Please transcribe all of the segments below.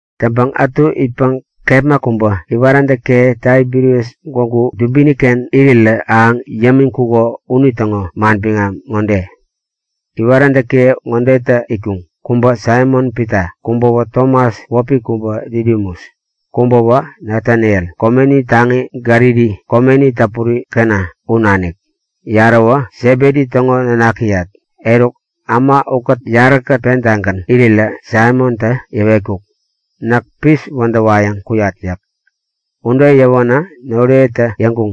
Täŋpäŋ ätu itpäŋ kepma kubä iwaräntäkiye Taibirias gwägu dubini-ken irirä ahäŋ yämiŋkuko unitäŋo manbiŋam ŋode; Iwaräntäkiye ŋodetä itkuŋ; Kubä Saimon-Pita. Kubäwä Tomas wäpi kubä Didimus. Kubäwä Nataniel, komeni taŋi Galili, komeni täpuri Kana, u nanik. Yaräwä Sebedi täŋo nanakiyat. Eruk äma ukät yaräkät pentagän irirä Saimontä yäwetkuk; Näk pis wädäwayäŋ kuyat yäk. Ude yäwänä noriyetä yäŋkuŋ;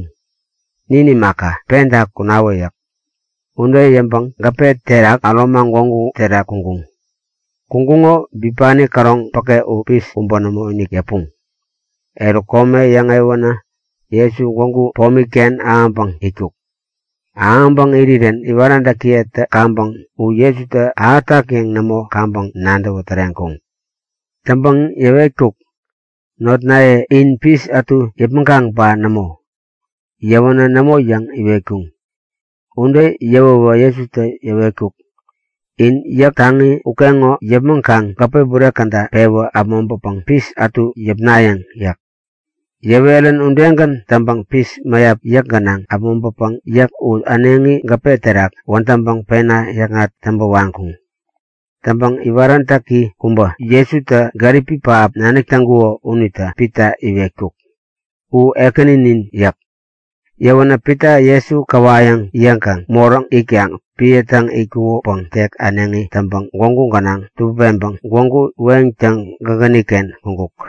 Nin imaka, penta kunawä yäk. Ude yäŋpäŋ gäpe terak äromaŋ gwägu terak kuŋkuŋ. Kuŋkuŋo bipani käroŋ päke u pis kubä nämoinik yäpuŋ. Eruk kome yäŋewänä Jesu gwägu pomi-ken ahäŋpäŋ itkuk. Ahäŋpäŋ irirän iwaräntäkiyetä kaŋpäŋ u Jesutä ahätak yäŋ nämo kaŋpäŋ nadäwä täreŋkuŋ. Täŋpäŋ yäwetkuk; Notnaye, in pis ätu yäpmäŋkaŋ ba nämo? Yäwänä nämo yäŋ iwetkuŋ. Ude yäwäwä Jesutä yäwetkuk; In yäk taŋi ukeŋo yäpmäŋkaŋ gäpe bure käda pewi äpmoŋpäpäŋ pis ätu yäpnayäŋ yäk. Yäwerän udegän täŋpäŋ pis mäyap yäk gänaŋ äpmoŋpäpäŋ yäk u äneŋi gäpe terak wädäŋpäŋ pena yäkŋat täŋpä waŋkuŋ. Täŋpäŋ iwaräntäki kubä, Jesutä gäripi pähap nadäk täŋkuko unitä Pita iwetkuk; U Ekäninin! yäk. Yäwänä Pita Jesu käwayäŋ yäŋkaŋ, moräŋ itkaŋ epän täŋ itkukopäŋ tek äneŋi täŋpäŋ gwägu gänaŋ tubäpeŋpäŋ gwägu weŋtäŋ gägäni-ken kuŋkuk.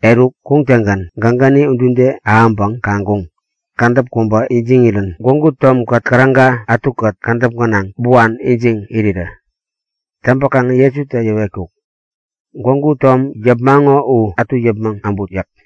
Eruk kuŋtäŋgän gägäni udude ahäŋpäŋ kaŋkuŋ; Kädäp kubä ijiŋirän gwägu tomkät käräga ätukät kädäp gänaŋ buan ijiŋ irirä. Täŋpäkaŋ Jesutä yäwetkuk; Gwägu tom yäpmaŋo u ätu yäpmäŋ äbut yäk.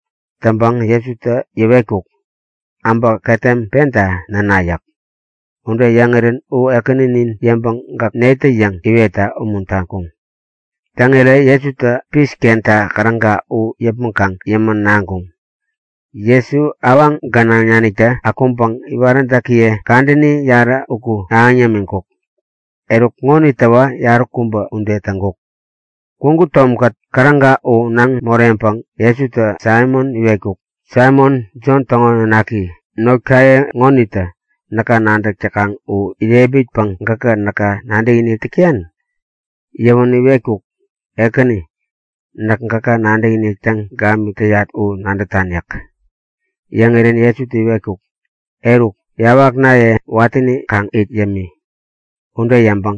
Täŋpäŋ Jesutä yäwetkuk; Äbä ketem penta näna yäk. Ude yäŋirän u Ekäninin yäŋpäŋ gäk netä yäŋ iwetta umuntaŋkuŋ. Täŋirä Jesutä pis kenta käräga u yäpmäŋkaŋ yämän naŋkuŋ. Jesu awaŋ gänaŋ naniktä akuŋpäŋ iwaräntäkiye kadäni yarä uku ahäŋ yämiŋkuk. Eruk ŋonitäwä kadäni yaräkubä ude täŋkuk. Gwägu tomkät käräga u naŋ moreŋpäŋ Jesutä Saimon iwetkuk; Saimon, Jon täŋo nanaki, Notkaye ŋonitä näka nadäk täkaŋ u irepmitpäŋ gäk näka nadäkinik täk täyan? Yäwänä iwetkuk; Ekäni, näk gäka nadäkinik täŋ gamik täyat u nadätan yäk. Yäŋirän Jesutä iwetkuk; Eruk, yawaknaye watäni kaŋ it yämi! Jesutä ude yäŋpäŋ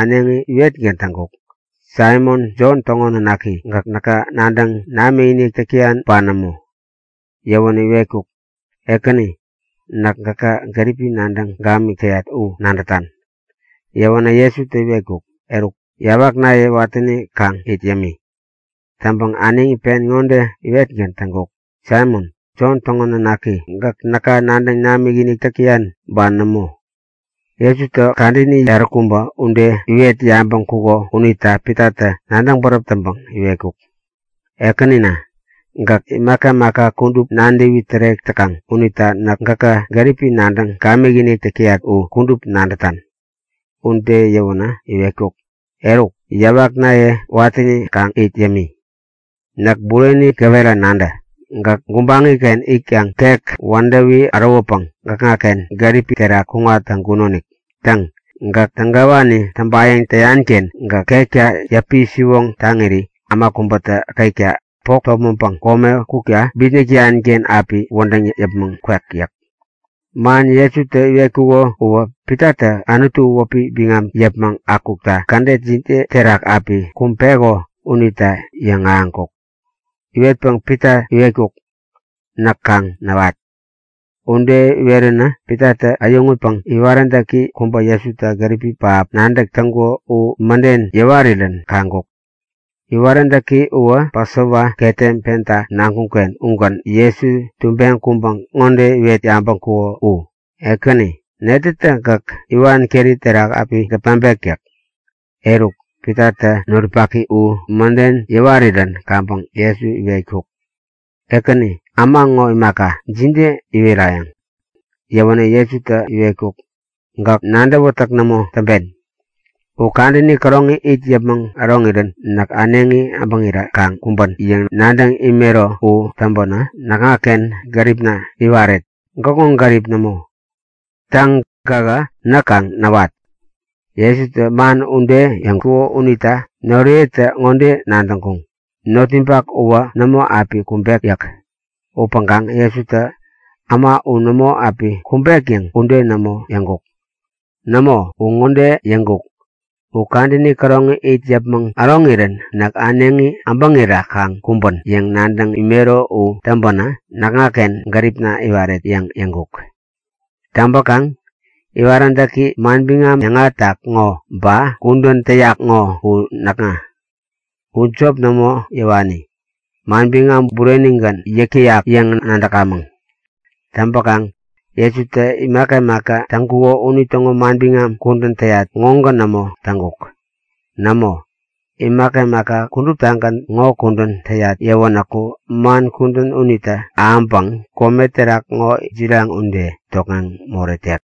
äneŋi iwetgän täŋkuk; Saimon, Jon täŋo nanaki, gäk näka nadäŋ namikinik täk täyan ba nämo? Yäwänä iwetkuk; Ekäni, näk gäka gäripi nadäŋ gamik täyat u nadätan. Yäwänä Jesutä iwetkuk; Eruk, yawaknaye watäni kaŋ it yämi! Täŋpäŋ äneŋi pen ŋode iwetgän täŋkuk; Saimon, Jon täŋo nanaki, gäk näka nadäŋ namikinik täk täyan ba nämo? Jesutä kadäni yaräkubä ude iwet yabäŋkuko unita Pitatä nadäŋ bäräp täŋpäŋ iwetkuk; Ekänina, gäk imaka imaka kudup nadäwi tärek täkaŋ unita näk gäka gäripi nadäŋ gamikinik täk täyat u kudup nadätan! Ude yäwänä iwetkuk; Eruk, yawaknaye watäni kaŋ it yämi! Näk bureni gäwera nadä; Gäk gubaŋi-ken itkaŋ tek wädäwi ärowäpäŋ gäkŋaken gärip terak kuŋat täŋkunonik. Täŋ, gäk tägawani täŋpayäŋ täyan-ken gäk ketka yäpi-siwoŋtaŋiri äma kubätä ketka bok topmäŋpäŋ kome kukta bitnäk täyan-ken api wädäŋ yäpmäŋ kwek yäk. (Man Jesutä iwetkuko uwä Pitatä Anutu wäpi biŋam yäpmäŋ akukta kädet jide terak api kumbeko unita yäŋahäŋkuk.) Iwetpäŋ Pita iwetkuk; Näk kaŋ näwat! Ude iweränä Pitatä äyäŋutpäŋ iwaräntäki kubä Jesutä gäripi pähap nadäk täŋkuko u mäden yäwarirän kaŋkuk. (Iwaräntäki uwä Pasova ketem penta naŋkuŋ-ken ugän Jesu tubeŋ kuŋpäŋ ŋode iwet yabäŋkuko u; Ekäni, netätä gäk iwan keri terak api gepmaŋpek yäk?) Eruk Pitatä noripaki u mäden yäwarirän kaŋpäŋ Jesu iwetkuk; Ekäni, äma ŋo imaka, jide iwerayäŋ? Yäwänä Jesutä iwetkuk; Gäk nadäwätäk nämo täŋpen. U kadäni käroŋi it yäpmäŋ äroŋirän näk äneŋi abäŋira kaŋ kumbän yäŋ nadäŋ imero u täŋpänä näkŋaken gäripna iwaret, gäkŋo gärip nämo. Täŋ, gähä näk kaŋ näwat! Jesutä man ude yäŋkuko unita noriyetä ŋode nadäŋkuŋ; Notninpak uwä nämo api kumbek yäk. Upäŋkaŋ Jesutä äma u nämo api kumbek yäŋ ude nämo yäŋkuk. Nämo, u ŋode yäŋkuk; U kadäni käroŋi it yäpmäŋ äroŋirän näk äneŋi abäŋira kaŋ kumbän yäŋ nadäŋ imero u täŋpänä näkŋaken gäripna iwaret yäŋ yäŋkuk. Täŋpäkaŋ iwaräntäki manbiŋam yäŋahätak ŋo ba kudän täyak ŋo u näkŋa. U jop nämo yäwani, manbiŋam burenigän yäk täyak yäŋ nadäkamäŋ. Täŋpäkaŋ Jesutä imaka imaka täŋkuko unitäŋo manbiŋam kudän täyat ŋogän nämo täŋkuk. Nämo, imaka imaka kuduptagän ŋo kudän täyat yäwänäku man kudän unitä ahäŋpäŋ kome terak ŋo jiraŋ ude tokŋeŋ moretek.